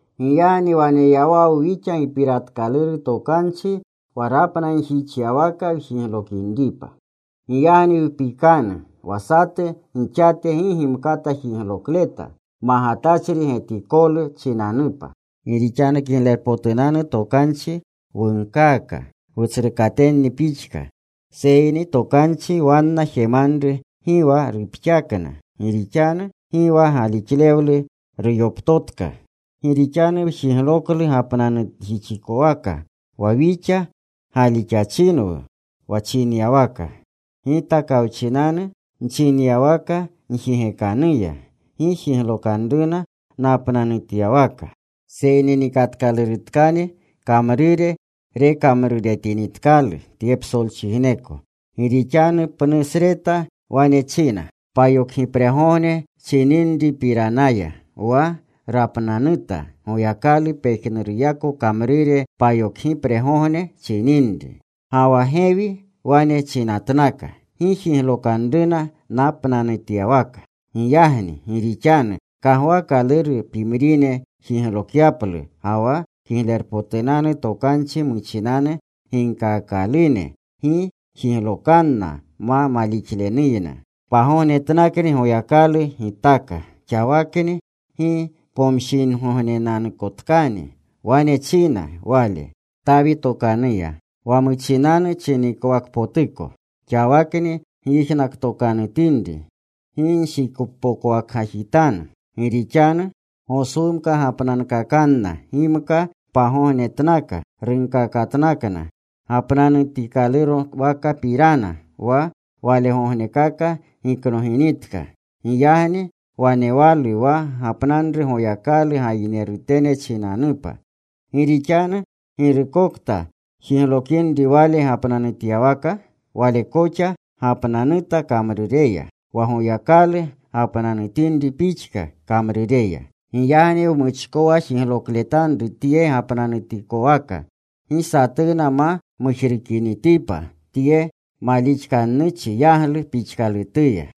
Giyagni waneyawawu wixa gipiratkaluru tokanchi wa rapnanjixyawaka wjiglokinripa. Giyagni wpikanu wa satu gixate gi gimkata jiglokleta, magatachri getikolu chinanupa. Gi rixanu Kiglerpotunanu Tokanchi wunkaaka wutsrukatenni pixka. Seyni tokanchi wanna jemanru gi wa rupxakna, gi rixanu gi wa galixlewlu ruyoptotka. Gi rixanu wjigloklu gapnanjixikowaka wa wixa galixachinwu, wa chinyawaka: Gita kawchinanu nchinyawaka njigekanuya, Gi jiglokanruna napnajixyawaka. Seyni nikatkalurutkani kamrure rekamruretinitkalu tye psolchijneko. Gi rixanu pnusreta wane china, payokgipregogne chininripiranaya, wa rapnanuta Goyakalu pejnuruyako kamrure payokgipregogne chininri. Ga wa gewi wane chinatnaka: Gi jiglokanruna napnanutyawaka. Giyagni gi rixanu kagwaakaluru pimrine jiglokyaplu ga wa Kiglerpotunanu Tokanchi muchinanu ginkaakalune gi jiglokanna ma malixlenuyna, pagognetnakni Goyakalu gitaka. Xawakni gi pomshinigognenanukotkani wane china Wale, Tawi tokanuya, wa muchinanu chinikowakpotuko: Xawakni gyijnaktokanutinri, gi nshikpokwakgajitanu. Gi rixanu Goswumka gapnankakanna gimka pagognetnaka runkakatnakna gapnanutikowakapirana, wa walegognekaka giknoginitka. Giyagni wanewalu wa gapnanru Goyakalu gayinerutene chinanupa. Gi rixanu girukokta jiglokinri wale gapnanutyawaka, wale koxa gapnanuta kamrureya, wa Goyakalu rapnanutinri pixka kamrureya. Giyagni wmuchkowa jiglokletanru tye gapnanutikowaka, gi satuna ma mujrukinitipa tye malixkannuchi yaglu pixkalutuya.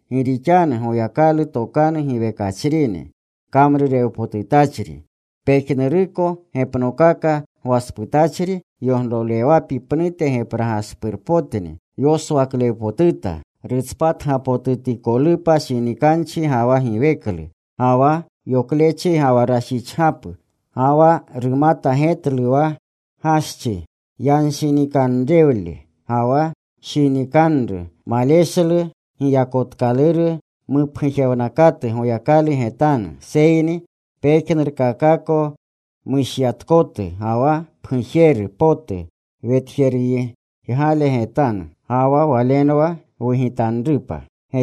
Gi rixanu Goyakalu tokanu giwekachrini. Kamrurewpotutachri. Pejnuruko gepnokaka gwasputachri yoglolewapi pnute gepragaspurpotni. Yoswaklewpotuta rutspatgapotutikolupa shinikanchi ga wa giweklu ga wa yoklechi ga wa rashichgapu. Ga wa rumata getlu wa gaschi yanshinikanrewle ga wa rushinikanru. Maleshlu giyakotkaluru mupgujewnakatu Goyakalu getanu. Seyni pejnurkakako mushyatkotu ga wa pgujeru potu wetjeruygale getanu. Ga wa Walenwa wugitanrupa.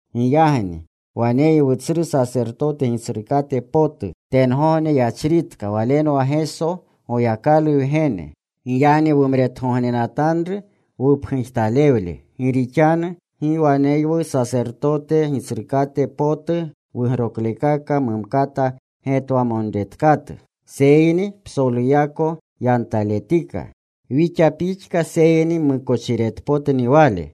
Giyagni waneywu tsru sasertote Gitsrukate potu tengogne yachritka. Walenwa Geso Goyakalu Wgene. Giyagni wumretgognenatanru wupgujtalewle. Gi rixanu gi waneywu sasertote Gitsrukate potu wugroklekaka mumkata getwamonretkatu. Seyni psoluyako yantaletika wixa pixka seyni mmukochiretpotni Wale.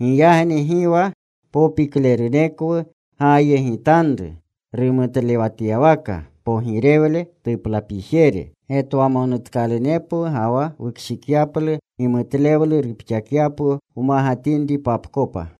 Giyagni gi wa popiklerunekwu gaayegitanru rumutlewatyawaka pogirewle tuplapijere, getwamonutkalunepwu ga wa wukshikyaplu gimutlewlu rupxakyapwu wmagatinripapkopa.